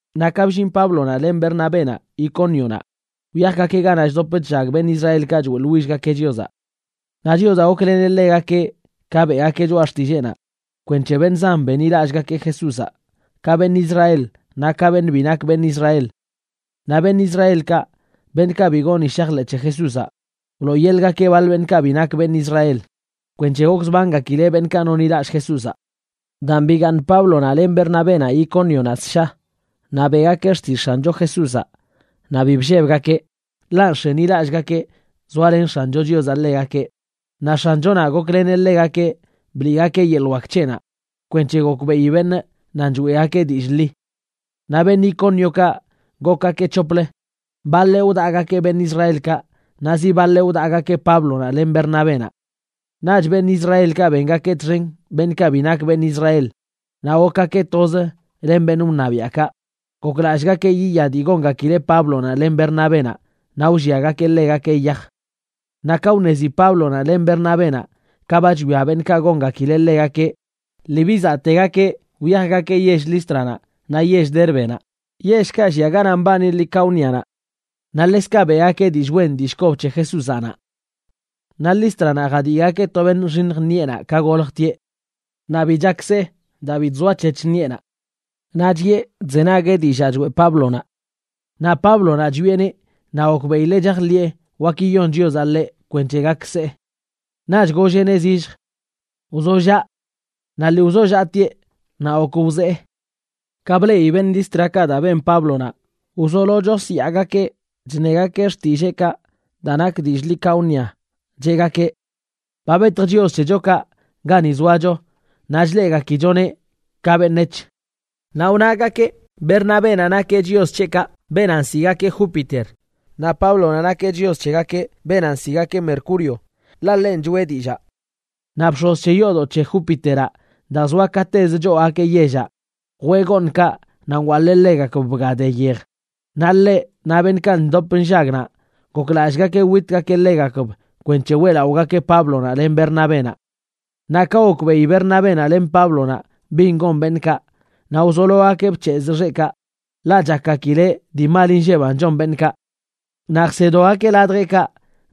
Naꞌ ka bllin Páblonaꞌ len Bernabénaꞌ Icónionaꞌ, wyajgakeꞌ ganaꞌ chdop chllag beṉꞌ Israelkaꞌ choeꞌḻwillgakeꞌ Chiozaꞌ. Naꞌ Chiozaꞌ gokleneꞌ ḻegakeꞌ ka beꞌgakeꞌ choꞌa xtilleenaꞌ kwenc̱he beṉꞌ zan benḻilallꞌgakeꞌ Jesúzaꞌ, ka beṉꞌ Israel naꞌ ka beṉꞌ bi nak beṉꞌ Israel. Naꞌ beṉꞌ Israelkaꞌ, beṉꞌkaꞌ bi goni shajḻeꞌ c̱he Jesúzaꞌ, wlooyeḻꞌgakeꞌ baḻ beṉꞌkaꞌ bi nak beṉꞌ Israel kwenc̱he gokzbangakileꞌ beṉꞌkaꞌ nonḻilallꞌ Jesúzaꞌ. Daan bigaaṉ Páblonaꞌ len Bernabénaꞌ Icónionaꞌ ssha, naꞌ beꞌgakeꞌ xtillꞌ X̱ancho Jesúzaꞌ naꞌ bi bllebgakeꞌ, ḻaꞌ nx̱enilallꞌgakeꞌ zoalen X̱ancho Chiozaꞌ ḻegakeꞌ. Naꞌ X̱anchonaꞌ gokleneꞌ ḻegakeꞌ bliꞌgakeꞌ yeḻꞌ wak c̱heꞌnaꞌ kwenc̱he gokbeꞌi beṉꞌ nan choeꞌgakeꞌ dillꞌ ḻi. Naꞌ beṉꞌ Icóniokaꞌ gokgakeꞌ c̱hoplə, baḻeꞌ wdaꞌgakeꞌ beṉꞌ Israelkaꞌ naꞌ zi baḻeꞌ wdaꞌgakeꞌ Páblonaꞌ len Bernabénaꞌ. Naꞌch beṉꞌ Israelkaꞌ bengakeꞌ txen beṉꞌkaꞌ bi nak beṉꞌ Israel naꞌ gokgakeꞌ toz len beṉꞌ wṉabiaꞌkaꞌ, goklallꞌgakeꞌ yiya dii gongakileꞌ Páblonaꞌ len Bernabénaꞌ naꞌ wlliagakeꞌ ḻegakeꞌ yaj. Naꞌ ka wṉezi Páblonaꞌ len Bernabénaꞌ ka ba chwia beṉꞌkaꞌ gongakileꞌ ḻegakeꞌ, lii bizaꞌtegakeꞌ, wyajgakeꞌ yell Lístranaꞌ naꞌ yell Dérbenaꞌ, yellkaꞌ llia ganaꞌ mbani Licaónianaꞌ. Naꞌ ḻekzkaꞌ beꞌgakeꞌ dillꞌ wen dillꞌ kob c̱he Jesúzaꞌ naꞌ. Naꞌ Lístranaꞌ jadiꞌgakeꞌ to beṉꞌ nxiṉj ṉiꞌenaꞌ ka goljtieꞌ. Naꞌ bi chak see daa bi chzoa c̱hec̱h ṉiꞌenaꞌ. Naꞌ chiꞌe chzenagueꞌ dillaa choeꞌ Páblonaꞌ. Naꞌ Páblonaꞌ chwieꞌneꞌ naꞌ gokbeꞌileꞌ chajḻiꞌe wak yiyon Chiozaꞌ ḻeꞌ kwenc̱he gak see. Naꞌch golleꞌneꞌ zillj: ―Wzollaꞌ. Naꞌ lii wzollaꞌtieꞌ naꞌ gok wzee. Ka bleꞌi beṉꞌ Lístrakaꞌ daa ben Páblonaꞌ, wzolo chosyaagakeꞌ chṉegakeꞌ xtilleekaꞌ daa nak dillꞌ Licaonia cheꞌgakeꞌ: ―¡Ba betj chios c̱hechokaꞌ gani zoacho naꞌ chleꞌgakichoneꞌ ka beṉec̱h! Naꞌ wnagakeꞌ Bernabénaꞌ nakeꞌ chios c̱heꞌkaꞌ beenaꞌ nsiꞌgakeꞌ Júpiter, naꞌ Páblonaꞌ nakeꞌ chios c̱heꞌkaꞌ beenaꞌ nsiꞌgakeꞌ Mercurio, ḻaꞌ ḻenꞌ choꞌe dillaa. Naꞌ bx̱oz c̱he yoodoꞌ c̱he Júpiteraꞌ, daa zoa katez choogakeꞌ yellaꞌ, jwee gooṉkaꞌ naꞌ nwaḻee ḻegakb bga de yej, naꞌ ḻeꞌ, naꞌ beṉꞌkaꞌ ndop nllag naꞌ, goklallꞌgakeꞌ witgakeꞌ ḻegakb kwenc̱he weꞌlaꞌogakeꞌ Páblonaꞌ len Bernabénaꞌ. Naꞌ ka gokbeꞌi Bernabénaꞌ len Páblonaꞌ bin gon beṉꞌkaꞌ, naꞌ wzologakeꞌ bc̱hezꞌ xeꞌkaꞌ, ḻaꞌ chakgakileꞌ dii mal nlleban chon beṉꞌkaꞌ. Naꞌ jsedogakeꞌ ladjeꞌkaꞌ,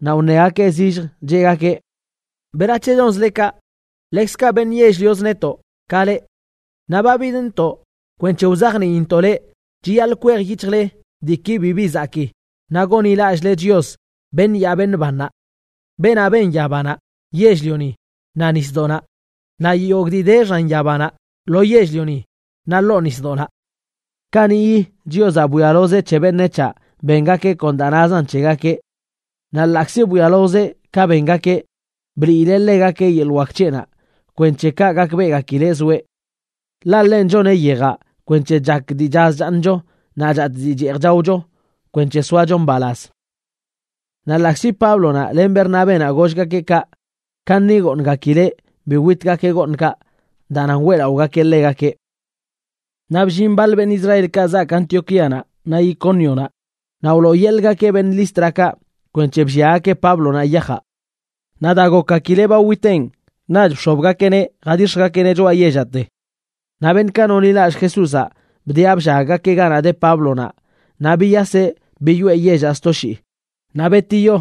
naꞌ wṉegakeꞌ zillj, cheꞌgakeꞌ: ―Leꞌ beṉꞌdoꞌ, ¿berac̱he chonzle kaꞌ? Ḻekzkaꞌ beṉꞌ yell-lioz netoꞌ, ka leꞌ, naꞌ ba bidntoꞌ kwenc̱he wzajniintoꞌ leꞌ chiyaḻꞌ kwejyic̱hjle diiki bibi zakꞌ naꞌ gonḻilallꞌle Chios, beṉꞌ yaa beṉꞌ bannaꞌ, beenaꞌ ben yabanaꞌ, yell-lioni, naꞌ nisdoꞌnaꞌ, naꞌ yogꞌ dii de xan yabanaꞌ, lo yell-lioni, naꞌ ḻoo nisdoꞌnaꞌ. Kaniꞌyi Chiozaꞌ bwialozeꞌ c̱he beṉec̱haꞌ bengakeꞌ kon daa nazan c̱hegakeꞌ. Naꞌ ḻaꞌkzi bwialozeꞌ ka bengakeꞌ, bliileꞌ ḻegakeꞌ yeḻꞌ wak c̱heꞌnaꞌ kwenc̱he kaꞌ gakbeꞌgakileꞌ zoeꞌ. Ḻaꞌ ḻenꞌ choneꞌ yejaꞌ kwenc̱he chak dii chaz chaaṉcho naꞌ chatꞌ dii cheej chaocho kwenc̱he soacho mbalaz. Naꞌ ḻaꞌkzi Páblonaꞌ len Bernabénaꞌ gollgakeꞌ kaꞌ, kaṉi goongakileꞌ bi witgakeꞌ gooṉkaꞌ daa nan weꞌlaꞌogakeꞌ ḻegakeꞌ. Naꞌ bllin baḻ beṉꞌ Israelkaꞌ zaak Antioquíanaꞌ naꞌ Icónionaꞌ, naꞌ wlooyeḻꞌgakeꞌ beṉꞌ Lístrakaꞌ kwenc̱he blliagakeꞌ Páblonaꞌ yajaꞌ. Naꞌ daa gokgakileꞌ ba witenꞌ, naꞌch bx̱obgakeꞌneꞌ jadix̱jgakeꞌneꞌ choꞌa yellaꞌte. Naꞌ beṉꞌkaꞌ nonḻilallꞌ Jesúzaꞌ bdiꞌa bllaggakeꞌ ganaꞌ de Páblonaꞌ, naꞌ biyaseꞌ biyoꞌe yellaꞌ sto shii. Naꞌ betiyo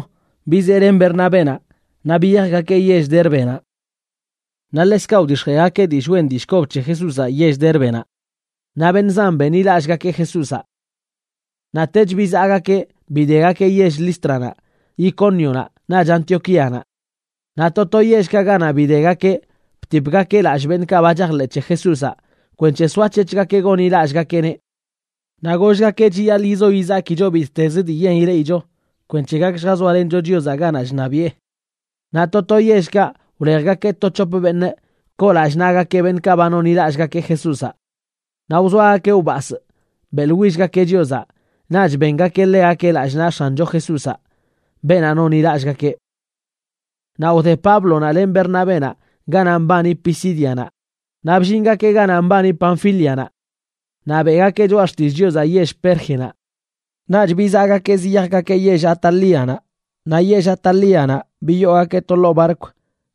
bizee len Bernabénaꞌ naꞌ biyajgakeꞌ yell Dérbenaꞌ. Naꞌ ḻekzkaꞌ wdix̱jeegakeꞌ dillꞌ wen dillꞌ kob c̱he Jesúzaꞌ yell Dérbenaꞌ, naꞌ beṉꞌ zan benḻilallꞌgakeꞌ Jesúzaꞌ. Naꞌtech, bizaꞌgakeꞌ bidegakeꞌ yell Lístranaꞌ, Icónionaꞌ naꞌch Antioquíanaꞌ. Naꞌ to to yellkaꞌ ganaꞌ bidegakeꞌ btipgakeꞌ lallꞌ beṉꞌkaꞌ ba chajḻeꞌ c̱he Jesúzaꞌ kwenc̱he soac̱hec̱hgakeꞌ gonḻilallꞌchgakeꞌneꞌ. Naꞌ gollgakeꞌ chiyaḻꞌ yizo yizakicho bittez dii yen ileꞌicho kwenc̱he gak lljazoalencho Chiozaꞌ ganaꞌ chṉabiꞌe. Naꞌ to to yellkaꞌ wlejgakeꞌ to c̱hop beṉꞌ koo lallꞌ naꞌgakeꞌ beṉꞌkaꞌ ba nonḻilallꞌgakeꞌ Jesúzaꞌ. Naꞌ wzoagakeꞌ wbasꞌ beꞌḻwillgakeꞌ Chiozaꞌ, naꞌch bengakeꞌ ḻegakeꞌ lallꞌ naꞌ X̱ancho Jesúzaꞌ, beenaꞌ nonḻilallꞌgakeꞌ. Naꞌ wde Páblonaꞌ len Bernabénaꞌ ganaꞌ mbani Pisídianaꞌ naꞌ bllingakeꞌ ganaꞌ mbani Panfílianaꞌ. Naꞌ beꞌgakeꞌ choꞌa xtillꞌ Chiozaꞌ yell Pérgenaꞌ. Naꞌch bizaꞌgakeꞌ ziyajgakeꞌ yell Atálianaꞌ. Naꞌ yell Atálianaꞌ biyoogakeꞌ to ḻoo barkw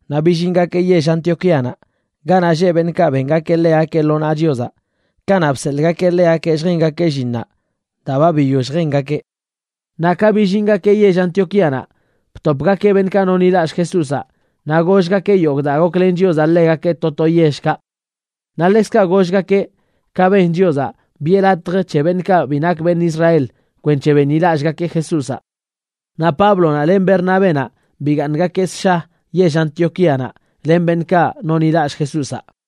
naꞌ billingakeꞌ yell Antioquíanaꞌ ganaꞌ lleꞌ beṉꞌkaꞌ bengakeꞌ ḻegakeꞌ lo naꞌ Chiozaꞌ kanaꞌ bseḻꞌgakeꞌ ḻegakeꞌ lljengakeꞌ llinnaꞌ daa ba biyoll jengakeꞌ. Naꞌ ka billingakeꞌ yell Antioquíanaꞌ, btopgakeꞌ beṉꞌkaꞌ nonḻilallꞌ Jesúzaꞌ, naꞌ gollgakeꞌ yogꞌ daa goklen Chiozaꞌ ḻegakeꞌ to to yellkaꞌ. Naꞌ ḻekzkaꞌ gollgakeꞌ ka ben Chiozaꞌ biꞌe latj c̱he beṉꞌkaꞌ bi nak beṉꞌ Israel kwenc̱he benḻilallꞌgakeꞌ Jesúzaꞌ. Naꞌ Páblonaꞌ len Bernabénaꞌ bigaaṉgakeꞌ ssha yell Antioquíanaꞌ len beṉꞌkaꞌ nonḻilallꞌ Jesúzaꞌ.